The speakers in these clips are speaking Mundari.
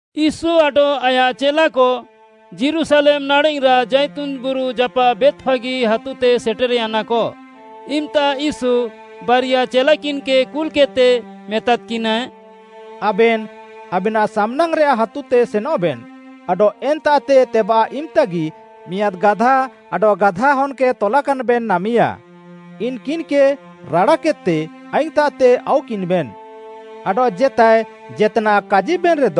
ୟୀଶୁ ଆଡଃ ଆୟାଃ ଚେଲାକ ଯୀରୁଶାଲେମ୍‌ ନାଡ଼େଃରାଃ ଜାଇତୁନ୍‌ ବୁରୁ ଜାପାଃ ବେତ୍‌ଫାଗି ହାତୁତେ ସେଟେର୍‌ୟାନାକ, ଇମ୍‌ତା ୟୀଶୁ ବାରିଆ ଚେଲାକିନ୍‌କେ କୁଲ୍‍କେଦ୍‍ତେ, ମେତାଦ୍‌କିନାଏ “ଆବେନ୍‌ ଆବେନାଃ ସାମ୍‌ନାଙ୍ଗ୍‌ରେଆଃ ହାତୁତେ ସେନଃବେନ୍‌ ଆଡଃ ଏନ୍ତାଃତେ ତେବାଃ ଇମ୍‌ତାଗି ମିଆଁଦ୍‌ ଗାଧା ଆଡଃ ଗାଧାହନ୍‌କେ ତଲାକାନ୍‌ବେନ୍‌ ନାମିୟା, ଇନ୍‌କିନ୍‌କେ ରାଡ଼ାକେଦ୍‌ତେ ଆଇଙ୍ଗ୍‌ତାଃତେ ଆଉକିନ୍‌ବେନ୍‌। ଆଡଃ ଜେତାଏ ଜେତ୍‌ନାଃ କାଜିବେନ୍‌ରେଦ,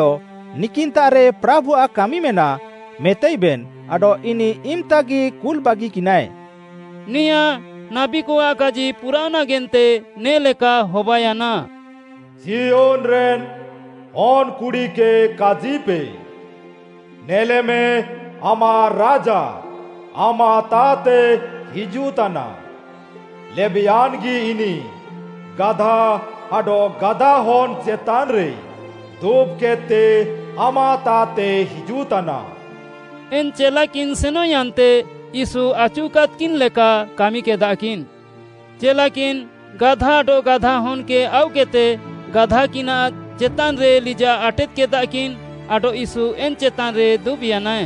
‘ନିକିନ୍‌ତାଃରେ ପ୍ରାଭୁଆଃ କାମିମେନାଃ’ ମେତାଇବେନ୍ ଆଡଃ ଇନିଃ ଇମ୍‌ତାଗି କୁଲ୍‍ବାଗିକିନାଏ।” ନେଆଁଁ ନାବୀକଆଃ କାଜି ପୁରାଅଃ ନାଗେନ୍ତେ ନେ ଲେକା ହବାୟାନା। “ସିୟୋନ୍‌ରେନ୍‌ ହନ୍‌କୁଡ଼ିକେ କାଜିପେ, ‘ନେଲେମେ, ଆମାଃ ରାଜା ଆମାଃତାଃତେ ହିଜୁଃତାନା! ଲେବେୟାନ୍‌ଗି ଇନିଃ, ଗାଧା ଆଡଃ ଗାଧାହନ୍‌ ଚେତାନ୍‌ରେ ଦୁବ୍‌କେଦ୍‌ତେ ଆମାଃତାଃତେ ହିଜୁଃତାନା।’” ଏନ୍‌ ଚେଲାକିନ୍ ସେନଃୟାନ୍ତେ ୟୀଶୁ ଆଚୁକାଦ୍‌କିନ୍ ଲେକା କାମିକେଦାକିନ୍‌। ଚେଲାକିନ୍‌ ଗାଧା ଆଡଃ ଗାଧାହନ୍‌କେ ଆଉକେଦ୍‌ତେ, ଗାଧାକିନାଃ ଚେତାନ୍‍ରେ ଲିଜାଃ ଆଟେଦ୍‌ କେଦାକିନ୍‌ ଆଡଃ ୟୀଶୁ ଏନ୍‌ ଚେତାନ୍‌ରେ ଦୁବ୍‌ୟାନାଏ।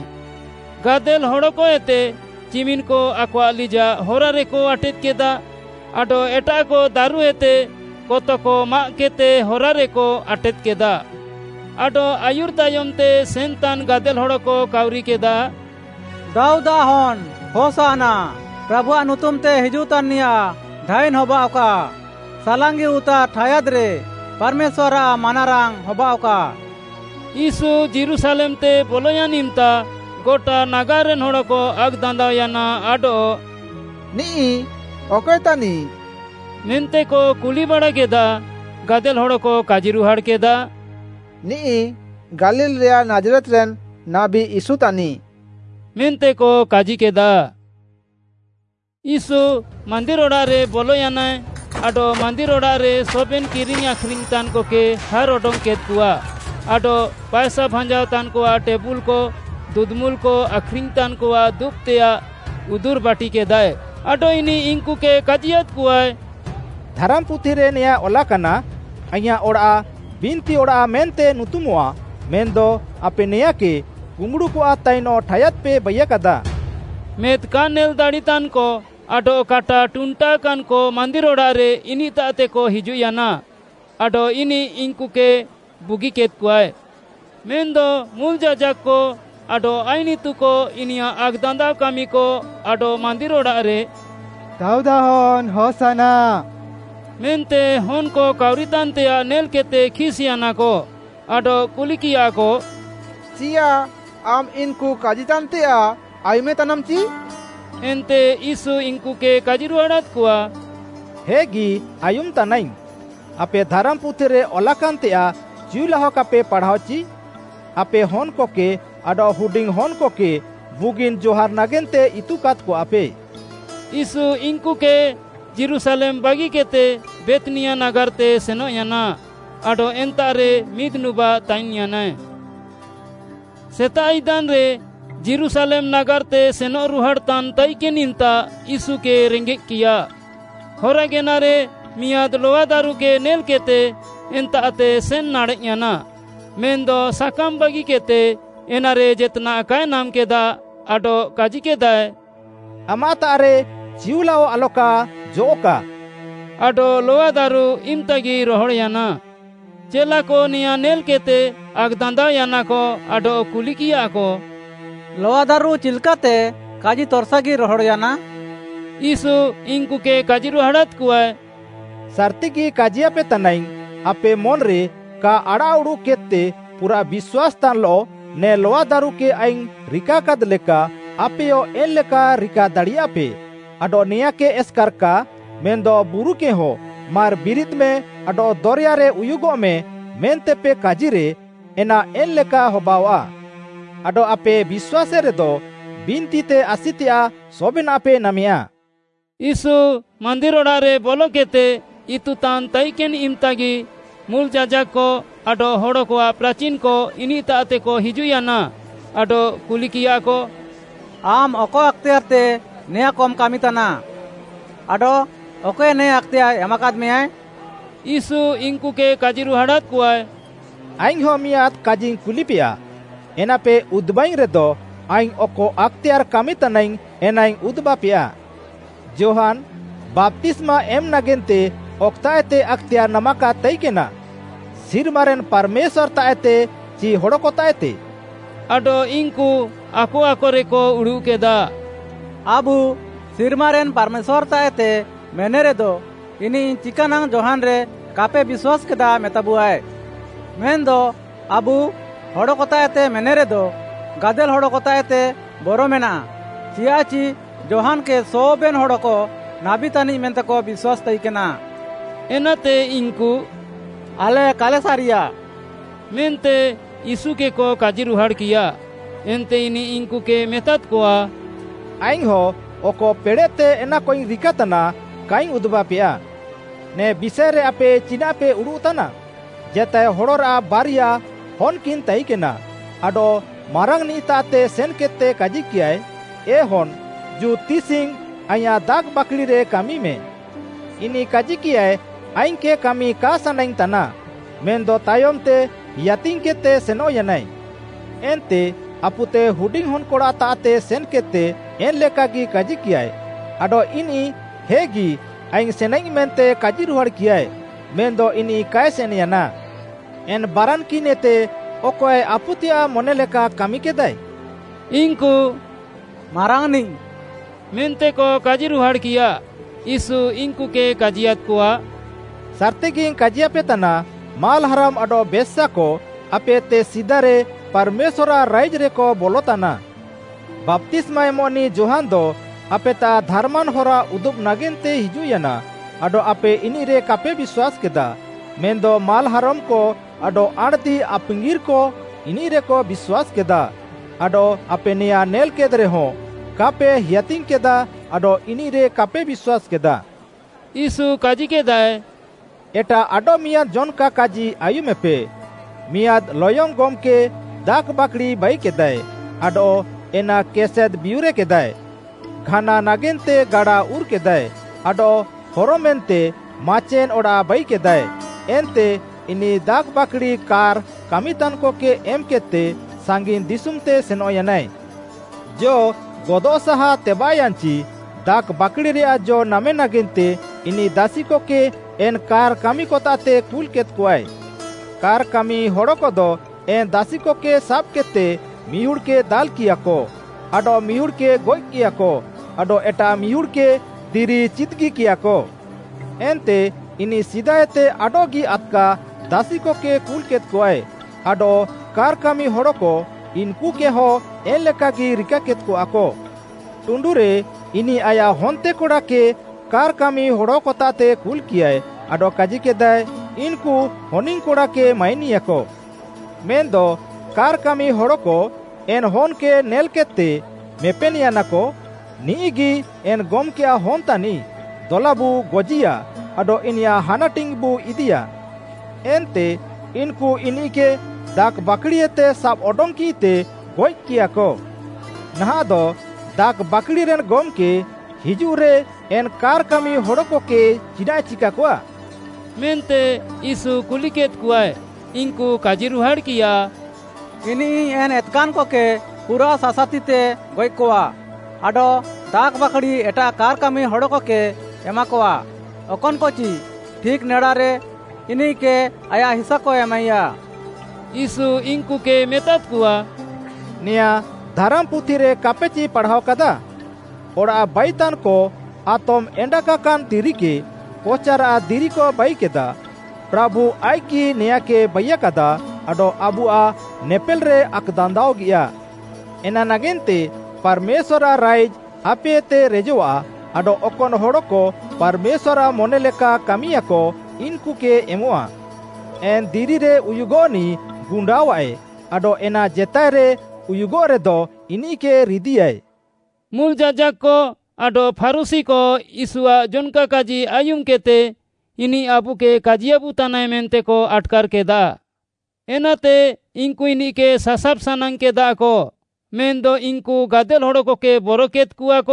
ଗାଦେଲ୍‌ହଡ଼କଏତେ ଚିମିନ୍‌କ ଆକଆଃ ଲିଜାଃ ହରାରେକ ଆଟେଦ୍‌କେଦା, ଆଡଃ ଏଟାଃକ ଦାରୁଏତେ କତକ ମାଆଃକେଦ୍‌ତେ ହରାରେକ ଆଟେଦ୍‌କେଦା। ଆଡଃ ଆୟୁର୍‌ ତାୟମ୍‌ତେ ସେନ୍‌ତାନ୍‌ ଗାଦେଲ୍‍ହଡ଼କ କାଉରିକେଦା, “ଦାଉଦ୍‌ଆଃ ହନ୍‌ ହୋଶାନ୍ନା, ପ୍ରାଭୁଆଃ ନୁତୁମ୍‌ତେ ହିଜୁଃତାନ୍‌ନିୟାଃ ଧାଇନ୍‌ ହବାଅଃକା, ସାଲାଙ୍ଗିଉତାର୍‌ ଠାୟାଦ୍‌ରେ ପାର୍‌ମେଶ୍ୱାର୍‌ଆଃ ମାନାରାଙ୍ଗ୍‌ ହବାଅଃକା।” ୟୀଶୁ ଯୀରୁଶାଲେମ୍‌ତେ ବଲୟାନ୍‌ ଇମ୍‌ତା ଗଟା ନାଗାର୍‌ରେନ୍‌ ହଡ଼କ ଆକ୍‌ଦାନ୍ଦାଅୟାନା ଆଡଃ “ନିଃ ଅକଏ ତାନିଃ?” ମେନ୍ତେକ କୁଲିବାଡ଼ାକେଦା। ଗାଦେଲ୍‌ ହଡ଼କ କାଜିରୁହାଡ଼୍‌କେଦା, “ନିଃ ଗାଲିଲ୍‌ରେୟାଃ ନାଜ୍‌ରେତ୍‌ରେନ୍‌ ନାବୀ ୟୀଶୁ ତାନିଃ” ମେନ୍ତେକ କାଜିକେଦା। ୟୀଶୁ ମାନ୍ଦିର୍‌ ଅଡ଼ାଃରେ ବଲୟାନାଏ ଆଡଃ ମାନ୍ଦିର୍‌ ଅଡ଼ାଃରେ ସବେନ୍‌ କିରିଙ୍ଗ୍‌ ଆଖ୍‌ରିଙ୍ଗ୍‌ ତାନ୍‌କକେ ହାର୍‌ ଅଡଙ୍ଗ୍‌କେଦ୍‌କଆ ଆଡଃ ପାଏସା ଭାଞ୍ଜାଅତାନ୍‌କଆଃ ଟେବୁଲ୍‌କ, ଦୁଦୁମୁଲ୍‌କ ଆଖ୍‌ରିଙ୍ଗ୍‌ତାନ୍‍କଆଃ ଦୁବ୍‌ତେୟାଃ ଉଦୁର୍‌ବାଟିକେଦାଏ, ଆଡଃ ଇନିଃ ଇନ୍‌କୁକେ କାଜିୟାଦ୍‌କଆଏ, “ଧାରାମ୍‌ପୁଥିରେ ନେଆଁଁ ଅଲାକାନା, ‘ଆଇଁୟାଃ ଅଡ଼ାଃ ବିନ୍ତିଅଡ଼ାଃ ମେନ୍ତେ ନୁତୁମଃଆ’ ମେନ୍‌ଦ ଆପେ ନେଆଁଁକେ କୁମ୍ବୁଡ଼ୁକଆଃ ତାଇନଃ ଠାୟାଦ୍‌ପେ ବାଇୟାକାଦା।” ମେଦ୍‌ କା ନେଲ୍‌ ଦାଡ଼ିତାନ୍‌କ ଆଡଃ କାଟା ଟୁଣ୍ଟାକାନ୍‍କ ମାନ୍ଦିର୍‌ ଅଡ଼ାଃରେ ଇନିଃତାଃତେକ ହିଜୁଃୟାନା ଆଡଃ ଇନିଃ ଇନ୍‌କୁକେ ବୁଗିକେଦ୍‌କଆଏ। ମେନ୍‌ଦ ମୁଲ୍‌ ଯାଜାକ୍‌କ ଆଡଃ ଆଇନ୍‌ ଇତୁକ ଇନିୟାଃ ଆକ୍‌ଦାନ୍ଦାଅକାମିକ ଆଡଃ ମାନ୍ଦିର୍‌ ଅଡ଼ାଃରେ “ଦାଉଦ୍‌ଆଃ ହନ୍‌ ହୋଶାନ୍ନା” ମେନ୍ତେ ହନ୍‌କ କାଉରିତାନ୍‌ତେୟାଃ ନେଲ୍‌କେଦ୍‌ତେ ଖିସ୍‌ୟାନାକ, ଆଡଃ କୁଲିକିୟାକ, “ଚିୟାଃ ଆମ୍‌ ଇନ୍‌କୁ କାଜିତାନ୍‌ତେୟାଃ ଆୟୁମେତାନାମ୍‌ଚି?” ଏନ୍ତେ ୟୀଶୁ ଇନ୍‌କୁକେ କାଜିରୁହାଡ଼ାଦ୍‌କଆ, “ହେଗି ଆୟୁମ୍‌ତାନାଇଙ୍ଗ୍‌। ଆପେ ଧାରାମ୍‌ପୁଥିରେ ଅଲାକାନ୍‌ତେୟାଃ ଚିଉଲାହ କାପେ ପାଢ଼ାଅଚି? ‘ଆପେ ହନ୍‌କକେ ଆଡଃ ହୁଡିଙ୍ଗ୍‌ ହନ୍‌କକେ ବୁଗିନ୍‌ ଜହାର୍‌ ନାଗେନ୍ତେ ଇତୁକାଦ୍‌କଆପେ।’” ୟୀଶୁ ଇନ୍‌କୁକେ ଯୀରୁଶାଲେମ୍‌ ବାଗିକେଦ୍‌ତେ ବେଥ୍‌ନିଆ ନାଗାର୍‌ତେ ସେନଃୟାନା ଆଡଃ ଏନ୍ତାଃରେ ମିଦ୍‌ନୁବାଃ ତାଇନ୍‌ୟାନାଏ। ସେତାଃ ଇଦାନ୍‌ରେ ଯୀରୁଶାଲେମ୍‌ ନାଗାର୍‌ତେ ସେନଃରୁହାଡ଼୍‌ତାନ୍‌ ତାଇକେନ୍‌ ଇମ୍‌ତା ୟୀଶୁକେ ରେଙ୍ଗେଃକିୟା। ହରାଗେନାରେ ମିଆଁଦ୍‌ ଲଆଦାରୁକେ ନେଲ୍‌କେଦ୍‌ତେ ଏନ୍ତାଃତେ ସେନ୍‌ ନାଡ଼େଃୟାନା, ମେନ୍‌ଦ ସାକାମ୍‌ ବାଗିକେଦ୍‌ତେ ଏନାରେ ଜେତ୍‌ନାଃ କାଏ ନାମ୍‌କେଦା ଆଡଃ କାଜିକେଦାଏ, “ଆମାଃତାଃରେ ଚିଉଲାଅ ଆଲକା ଜଅଃ'କା” ଆଡଃ ଲଆଦାରୁ ଇମ୍‌ତାଗି ରହଡ଼୍‌ୟାନା। ଚେଲାକ ନେଆଁଁ ନେଲ୍‍କେଦ୍‍ତେ ଆକ୍‌ଦାନ୍ଦାଅୟାନାକ ଆଡଃ କୁଲିକିୟାକ, “ଲଆଦାରୁ ଚିଲ୍‍କାତେ କାଜି ତର୍‍ସାଗି ରହଡ଼୍‌ୟାନା?” ୟୀଶୁ ଇନ୍‌କୁକେ କାଜିରୁହାଡ଼ାଦ୍‌କଆଏ, “ସାର୍‌ତିଗି କାଜିୟାପେ ତାନାଇଙ୍ଗ୍‌, ଆପେ ମନ୍‌ରେ କା ଆଡ଼ାଃଉଡ଼ୁଃକେଦ୍‌ତେ ପୁରାଃ ବିଶ୍ୱାସ୍‌ତାନ୍‌ଲଃ ନେ ଲଆଦାରୁକେ ଆଇଙ୍ଗ୍‌ ରିକାକାଦ୍‌ଲେକା, ଆପେୟ ଏନ୍‌ଲେକା ରିକାଦାଡ଼ିୟାପେ। ଆଡଃ ନେଆଁଁକେ ଏସ୍‌କାର୍‍ କା ମେନ୍‌ଦ ବୁରୁକେହଁ ‘ମାର୍‌ ବିରିଦ୍‌ମେ ଆଡଃ ଦରେୟାରେ ଉୟୁଗଃମେ’ ମେନ୍ତେପେ କାଜିରେ ଏନା ଏନ୍‌ଲେକା ହବାଅଆଃ। ଆଡଃ ଆପେ ବିଶ୍ୱାସେରେଦ, ବିନ୍ତିତେ ଆସିତେୟାଃ ସବେନାଃପେ ନାମେୟା।” ୟୀଶୁ ମାନ୍ଦିର୍‌ ଅଡ଼ାଃରେ ବଲକେଦ୍‌ତେ ଇତୁତାନ୍‌ ତାଇକେନ୍‌ ଇମ୍‍ତାଗି ମୁଲ୍‌ ଯାଜାକ୍‌କ ଆଡଃ ହଡ଼କଆଃ ପ୍ରାଚିନ୍‌କ ଇନିଃତାଃତେକ ହିଜୁଃୟାନା ଆଡଃ କୁଲିକିୟାକ, “ଆମ୍‌ ଅକ ଆକ୍‌ତେୟାର୍‌ତେ ନେଆଁଁକମ୍‌ କାମିତାନା? ଆଡଃ ଅକଏ ନେ ଆକ୍‌ତେୟାର୍‌ ଏମାକାଦ୍‌ମେୟାଏ?” ୟୀଶୁ ଇନ୍‌କୁକେ କାଜିରୁହାଡ଼ାଦ୍‌କଆଏ, “ଆଇଙ୍ଗ୍‌ହଁ ମିଆଁଦ୍‌ କାଜିଇଙ୍ଗ୍‌ କୁଲିପେୟା, ଏନାପେ ଉଦୁବାଇଙ୍ଗ୍‌ରେଦ ଆଇଙ୍ଗ୍‌ ଅକ ଆକ୍‌ତେୟାର୍‌ କାମିତାନାଇଙ୍ଗ୍‌ ଏନାଇଙ୍ଗ୍‌ ଉଦୁବାପେୟା। ଯୋହାନ୍‌, ବାପ୍ତିସ୍ମା ଏମ୍‌ ନାଗେନ୍ତେ ଅକ୍‌ତାଃଏତେ ଆକ୍‌ତେୟାର୍‌ ନାମାକାଦ୍‌ ତାଇକେନା? ସିର୍ମାରେନ୍‌ ପାର୍‌ମେଶ୍ୱାର୍‌ତାଃଏତେ ଚି ହଡ଼କତାଃଏତେ?” ଆଡଃ ଇନ୍‌କୁ ଆକ ଆକରେକ ଉଡ଼ୁଃକେଦା, “ଆବୁ, ‘ସିର୍ମାରେନ୍‌ ପାର୍‌ମେଶ୍ୱାର୍‌ତାଃଏତେ’ ମେନେରେଦ ଇନିଃ ‘ଚିକାନାଙ୍ଗ୍‌ ଯୋହାନ୍‌ରେ କାପେ ବିଶ୍ୱାସ୍‌କେଦା’ ମେତାବୁଆଏ? ମେନ୍‌ଦ ଆବୁ, ‘ହଡ଼କତାଃଏତେ’ ମେନେରେଦ, ଗାଦେଲ୍‌ ହଡ଼କତାଃଏତେ ବରମେନାଃ, ଚିୟାଃଚି ଯୋହାନ୍‌କେ ସବେନ୍‌ ହଡ଼କ ନାବୀ ତାନିଃ ମେନ୍ତେକ ବିଶ୍ୱାସୀ ତାଇକେନା।” ଏନାତେ ଇନ୍‌କୁ “ଆଲେ କାଲେ ସାରିୟା” ମେନ୍ତେ ୟୀଶୁକେକ କାଜିରୁହାଡ଼୍‌କିୟା। ଏନ୍ତେ ଇନିଃ ଇନ୍‌କୁକେ ମେତାଦ୍‌କଆ, “ଆଇଙ୍ଗ୍‌ହଁ ଅକ ପେଡ଼େଃତେ ଏନାକଇଙ୍ଗ୍‌ ରିକାତାନା, କାଇଙ୍ଗ୍‌ ଉଦୁବାପେୟା। “ନେ ବିଷାଏରେ ଆପେ ଚିନାଃପେ ଉଡ଼ୁଃତାନା? ଜେତାଏ ହଡ଼ରାଃ ବାରିଆ ହନ୍‌କିନ୍‌ ତାଇକେନା, ଆଡଃ ମାରାଙ୍ଗ୍‌ନିଃତାଃତେ ସେନ୍‌କେଦ୍‌ତେ କାଜିକିୟାଏ, ‘ଏ ହନ୍‌, ଜୁ ତିସିଙ୍ଗ୍‌ ଆଇଁୟାଃ ଦାଖ୍‌ବାକ୍‌ଡ଼ିରେ କାମିମେ।’ ଇନିଃ କାଜିକିୟାଏ, ‘ଆଇଙ୍ଗ୍‌କେ କାମି କା ସାନାଙ୍ଗ୍‌ ତାନାଃ,’ ମେନ୍‌ଦ ତାୟମ୍‌ତେ ହେୟାତିଙ୍ଗ୍‌କେଦ୍‌ତେ ସେନଃୟାନାଏ। ଏନ୍ତେ ଆପୁତେ ହୁଡିଙ୍ଗ୍‌ ହନ୍‌କଡ଼ାତାଃତେ ସେନ୍‌କେଦ୍‌ତେ ଏନ୍‌ଲେକାଗି କାଜିକିୟାଏ, ଆଡଃ ଇନିଃ ‘ହେଗି, ଆଇଙ୍ଗ୍‌ ସେନାଇଙ୍ଗ୍‌’ ମେନ୍ତେ କାଜିରୁହାଡ଼୍‌କିୟାଏ, ମେନ୍‌ଦ ଇନିଃ କାଏ ସେନ୍‌ୟାନା। ଏନ୍‌ ବାରାନ୍‌କିନ୍‌ଏତେ ଅକଏ ଆପୁତେୟାଃ ମନେଲେକା କାମିକେଦାଏ?” ଇନ୍‌କୁ “ମାରାଙ୍ଗ୍‌ନିଃ,” ମେନ୍ତେକ କାଜିରୁହାଡ଼୍‌କିୟା। ୟୀଶୁ ଇନ୍‌କୁକେ କାଜିୟାଦ୍‍କଆ, “ସାର୍‌ତିଗିଙ୍ଗ୍‌ କାଜିୟାପେତାନା, ମାଲ୍‌ହାରମ୍‌କ ଆଡଃ ବେଶ୍ୟାକ ଆପେଏତେ ସିଦାରେ ପାର୍‌ମେଶ୍ୱାର୍‌ଆଃ ରାଇଜ୍‌ରେକ ବଲତାନା। ବାପ୍ତିସ୍ମା ଏମଃନିଃ ଯୋହାନ୍‌ଦ ଆପେତାଃ ଧାର୍‌ମାନ୍‌ ହରା ଉଦୁବ୍‌ ନାଗେନ୍ତେ ହିଜୁଃୟାନା ଆଡଃ ଆପେ ଇନିଃରେ କାପେ ବିଶ୍ୱାସ୍‌କେଦା, ମେନ୍‌ଦ ମାଲ୍‌ହାରମ୍‌କ ଆଡଃ ଆଣ୍‌ଦିଆପାଙ୍ଗିର୍‌କ ଇନିଃରେକ ବିଶ୍ୱାସ୍‌କେଦା। ଆଡଃ ଆପେ ନେଆଁଁ ନେଲ୍‍କେଦ୍‌ରେହଁ, କାପେ ହେୟାତିଙ୍ଗ୍‌କେଦା ଆଡଃ ଇନିଃରେ କାପେ ବିଶ୍ୱାସ୍‌କେଦା। “ୟୀଶୁ କାଜିକେଦାଏ, ଏଟାଃ ଆଡଃମିଆଁଦ୍‌ ଜନ୍‌କା କାଜି ଆୟୁମେପେ। ମିଆଁଦ୍‌ ଲୟଙ୍ଗ୍‌ ଗମ୍‌କେ ଦାଖ୍‌ବାକ୍‌ଡ଼ି ବାଇକେଦାଏ ଆଡଃ ଏନା କେସେଦ୍‌ବିୟୁର୍‍କେଦାଏ, ଘାନା ନାଗେନ୍ତେ ଗାଡା ଉର୍‌କେଦାଏ, ଆଡଃ ହରମେନ୍ତେ ମାଚେନ୍‌ ଅଡ଼ାଃ ବାଇକେଦାଏ, ଏନ୍ତେ ଇନିଃ ଦାଖ୍‌ବାକ୍‌ଡ଼ି କାର୍‌ କାମିତାନ୍‌କକେ ଏମ୍‌କେଦ୍‌ତେ ସାଙ୍ଗିନ୍‌ ଦିଶୁମ୍‌ତେ ସେନଃୟାନାଏ। ଜ ଗଦଃ ସାହା ତେବାଃୟାନ୍‌ଚି, ଦାଖ୍‌ବାକ୍‌ଡ଼ିରେୟାଃ ଜ ନାମେ ନାଗେନ୍ତେ ଇନିଃ ଦାସିକକେ ଏନ୍‌ କାର୍‌ କାମିକତାଃତେ କୁଲ୍‌କେଦ୍‌କଆଏ। କାର୍‌କାମି ହଡ଼କଦ ଏନ୍‌ ଦାସିକକେ ସାବ୍‌କେଦ୍‌ତେ ମିହୁଡ଼୍‌କେ ଦାଲ୍‌କିୟାକ, ଆଡଃମିହୁଡ଼୍‌କେ ଗଏଃକିୟାକ, ଆଡଃ ଏଟାଃ ମିହୁଡ଼୍‌କେ ଦିରି ଚିଦ୍‌ଗିକିୟାକ। ଏନ୍ତେ ଇନିଃ ସିଦାଏତେ ଆଡଃଗି ଆଦ୍‌କା ଦାସିକକେ କୁଲ୍‌କେଦ୍‌କଆଏ, ଆଡଃ କାର୍‌କାମି ହଡ଼କ ଇନ୍‍କୁକେହ ଏନ୍‍ଲେକାଗି ରିକାକେଦ୍‌କଆକ। ଟୁଣ୍ଡୁରେ, ଇନିଃ, ଆୟାଃ ହନ୍ତେକଡ଼ାକେ କାର୍‌ କାମିହଡ଼କତାଃତେ କୁଲ୍‌କିୟାଏ, ଆଡଃ କାଜିକେଦାଏ, ‘ଇନ୍‌କୁ ହନିଙ୍ଗ୍‌କଡ଼ାକେ ମାଇନିୟାକ।’ ମେନ୍‌ଦ କାର୍‌କାମି ହଡ଼କ ଏନ୍‌ ହନ୍‌କେ ନେଲ୍‍କେଦ୍‍ତେ, ମେପେନ୍‌ୟାନାକ, ‘ନିଃଗି ଏନ୍‌ ଗମ୍‌କେୟାଃ ହନ୍‌ ତାନିଃ, ଦଲାବୁ ଗଜିୟା ଆଡଃ ଇନିୟାଃ ହାନାଟିଙ୍ଗ୍‌ବୁ ଇଦିୟା।’ ଏନ୍ତେ ଇନ୍‌କୁ ଇନିଃକେ ଦାଖ୍‌ବାକ୍‌ଡ଼ିଏତେ ସାବ୍ଅଡଙ୍ଗ୍‌କିଃତେ ଗଏଃକିୟାକ। “ନାହାଁଃଦ ଦାଖ୍‌ବାକ୍‌ଡ଼ିରେନ୍‌ ଗମ୍‌କେ ହିଜୁଃରେ ଏନ୍‌ କାର୍‌କାମି ହଡ଼କକେ ଚିନାଃଏ ଚିକାକଆ?” ମେନ୍ତେ ୟୀଶୁ କୁଲିକେଦ୍‌କଆଏ। ଇନ୍‌କୁ କାଜିରୁହାଡ଼୍‌କିୟା, “ଇନିଃ ଏନ୍‌ ଏତ୍‌କାନ୍‍କକେ ପୁରାଃ ସାସାତିତେ ଗଏଃକଆ ଆଡଃ ଦାଖ୍‌ବାକ୍‌ଡ଼ି ଏଟାଃ କାର୍‌କାମି ହଡ଼କକେ ଏମାକଆ, ଅକନ୍‌କଚି ଠିକ୍‌ ନେଡାରେ ଇନିଃକେ ଆୟାଃ ହିସାକ ଏମାଇୟା।” ୟୀଶୁ ଇନ୍‌କୁକେ ମେତାଦ୍‌କଆ, “ନେଆଁଁ ଧାରାମ୍‌ପୁଥିରେ କା'ପେଚି ପାଢ଼ାଅକାଦା? “‘ଅଡ଼ାଃ ବାଇତାନ୍‌କ ଆତମ୍‌ ଏଣ୍ଡାଗାକାନ୍ ଦିରିକେ କଚାରାଃ ଦିରିକ ବାଇକେଦା। ପ୍ରାଭୁ ଆଇଃକ୍‌ଗି ନେଆଁଁକେ ବାଇୟାକାଦା ଆଡଃ ଆବୁଆଃ ନେପେଲ୍‌ରେ ଆକ୍‌ଦାନ୍ଦାଅଗିୟା!’” “ଏନା ନାଗେନ୍ତେ ପାର୍‌ମେଶ୍ୱାର୍‌ଆଃ ରାଇଜ୍‌ ଆପେଏତେ ରେଜଃଆ ଆଡଃ ଅକନ୍‌ ହଡ଼କ ପାର୍‌ମେଶ୍ୱାର୍‌ଆଃ ମନେ ଲେକା କାମିୟାଃକ ଇନ୍‌କୁକେ ଏମଃଆ। “ଏନ୍‌ ଦିରିରେ ଉୟୁଗଃନିଃ ଗୁଣ୍ଡାଅଃଆଏ ଆଡଃ ଏନା ଜେତାଏରେ ଉୟୁଗଃରେଦ ଇନିଃକେ ରିଦିୟାଏ।” ମୁଲ୍‌ ଯାଜାକ୍‌କ ଆଡଃ ଫାରୁଶୀକ ୟୀଶୁଆଃ ଜନ୍‌କା କାଜି ଆୟୁମ୍‌କେଦ୍‌ତେ, ଇନିଃ ଆବୁକେ କାଜିୟାବୁତାନାଏ ମେନ୍ତେକ ଆଟ୍‌କାର୍‌କେଦା। ଏନାତେ ଇନ୍‌କୁ ଇନିଃକେ ସାସାବ୍‍ ସାନାଙ୍ଗ୍‌କେଦାକ, ମେନ୍‌ଦ ଇନ୍‌କୁ ଗାଦେଲ୍‍ ହଡ଼କକେ ବରକେଦ୍‌କଆକ,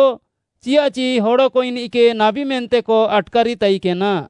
ଚିୟାଃଚି ହଡ଼କ ଇନିଃକେ ନାବୀ ମେନ୍ତେକ ଆଟ୍‌କାରି ତାଇକେନା।